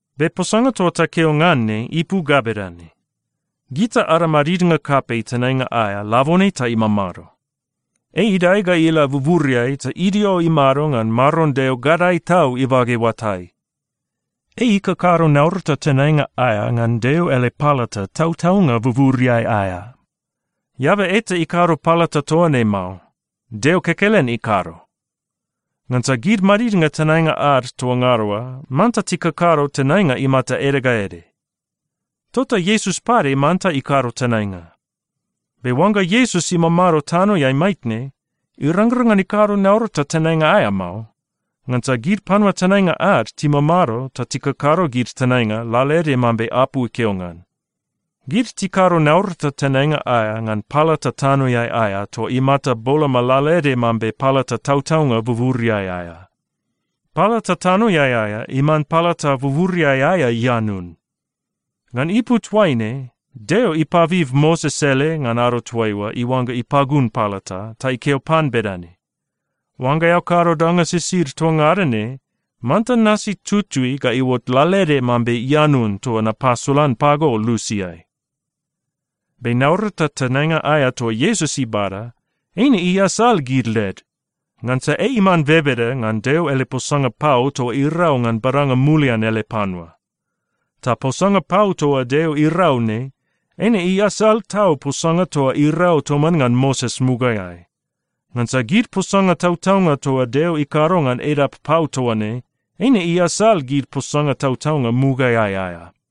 Be posanga toa takeo ngan ne ipu ga bedane: Gita ada madidnga kapei tenainga aea labone ta imamado. Ei idae ga ila buburiai ta idio imado ngan Maron Deo Gadae Tau ibage oatai. Ei ikakado naurata tenainga aea ngan Deo ele palata tautaunga buburiai aea. Eaba eta ikado palata toa ne mao. Deo kekelen ikado. Ngansa gid madidnga tenainga ad toa ngada oa manta tikakado tenainga imata ede ga ede. Tota Iesus pade manta ikado tenainga. Be oangga Iesus imamado tanoeai maitne, irangrang ngan ikado naurata tenainga aea mao, ngansa gid panua tenainga ad timamado ta tikakado gid tenainga lalaede mambe apu ikeo ngan. Gid tikado naurata tenainga aea ngan palata tanoeai aea toa imata boloma lalaede mambe palata tautaunga buburiai aea. Palata tanoeai aea iman palata buburiai aea ianun. Ngan ipu toaine, Deo ipabib Moses ele ngan ado toaiua iuangga ipagun palata, ta ikeo pan bedane, “Oangga eao kado danga sisid toa ngada ne, manta nasi tutui ga iuot lalaede mambe ianun toa napasolan pago lusiai.” Be naurata tenainga aea toa Iesus ibada, eine iasal gid led, ngansa ei iman bebeda ngan Deo ele posanga pau toa irau ngan badanga mulian ele panua. Ta posanga pau toa Deo irau ne, eine iasal tau posanga toa irau toman ngan Moses mugaeai, ngansa gid posanga tautaunga toa Deo ikado ngan edap pau toa ne, eine iasal gid posanga tautaunga mugaeai aea.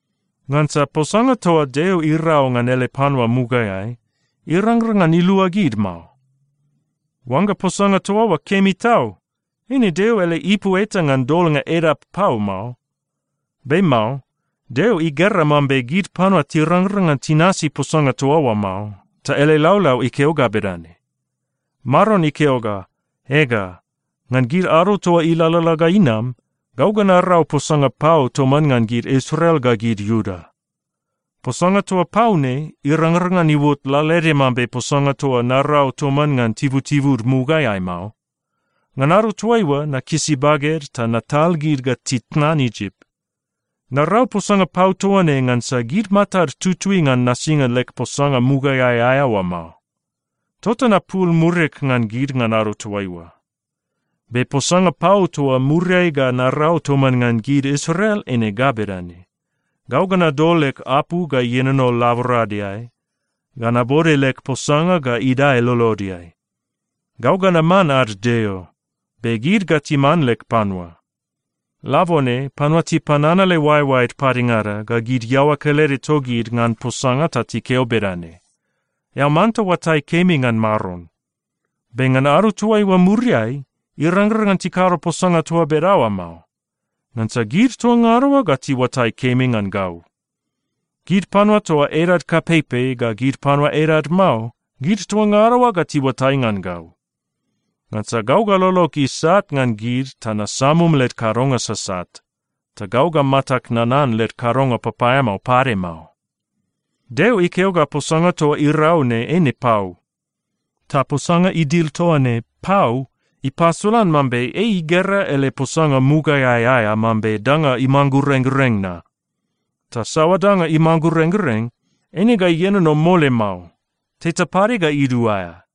Ngansa posanga toa Deo irau ngan ele panua mugaeai, irangrang ngan ilua gid mao. Oangga posanga toa oa kemi tau, eine Deo ele ipu eta ngan dolnga edap pau mao. Be mao. Deo igera mambe gid panua tirangrang ngan tinasi posanga toa oa mao, ta ele laulau ikeo ga bedane, “Maron ikeo ga, ‘Ega, ngan gid ado toa ilalala ga inam, gau ga narau posanga pau toman ngan gid Israel ga gid Iuda. Posanga toa pau ne irangrang ngan iuot lalaede mambe posanga toa narau toman ngan tibutibud mugaeai mao. Ngan ado toaiua, nakisi baged ta natal gid ga titnan Isip. Narau posanga pau toa ne ngansa gid matad tutui ngan nasinga leg posanga mugaeai aea oa mao. Tota napul murig ngan gid ngan ado toaiua. Be posanga pau toa muriai ga narau toman ngan gid Israel eine ga bedane: Gau ga nadol leg apu ga ienono laboradeai ga nabode leg posanga ga idae lolodeai. Gau ga naman ad Deo, be gid ga timan leg panua. Labone panua tipananale oaeoaed padengada ga gid iaoa kelede togid ngan posanga ta tikeo bedane, “Eao manta oatai kemi ngan Maron.” Be ngan ado toaiua muriai, irangrang ngan tikado posanga toa bedaoa mao, ngansa gid toa ngada oa ga tiuatai kemi ngan gau. Gid panua toa edad kapeipei ga gid panua edad mao, gid toa ngada oa ga tiuatai ngan gau. Ngansa gau ga lolog isat ngan gid ta nasamum led kadonga sasat. Ta gau ga matag nanan led kadonga papaeamao pade mao.’” Deo ikeo ga posanga toa irau ne eine pau. Ta posanga idil toa ne “pau” ipasolan mambe ei igera ele posanga mugaeai aea mambe danga imanggurenggureng na. Ta saoa danga imanggurenggureng, eine ga ienono mole mao. Teta pade ga iduaea.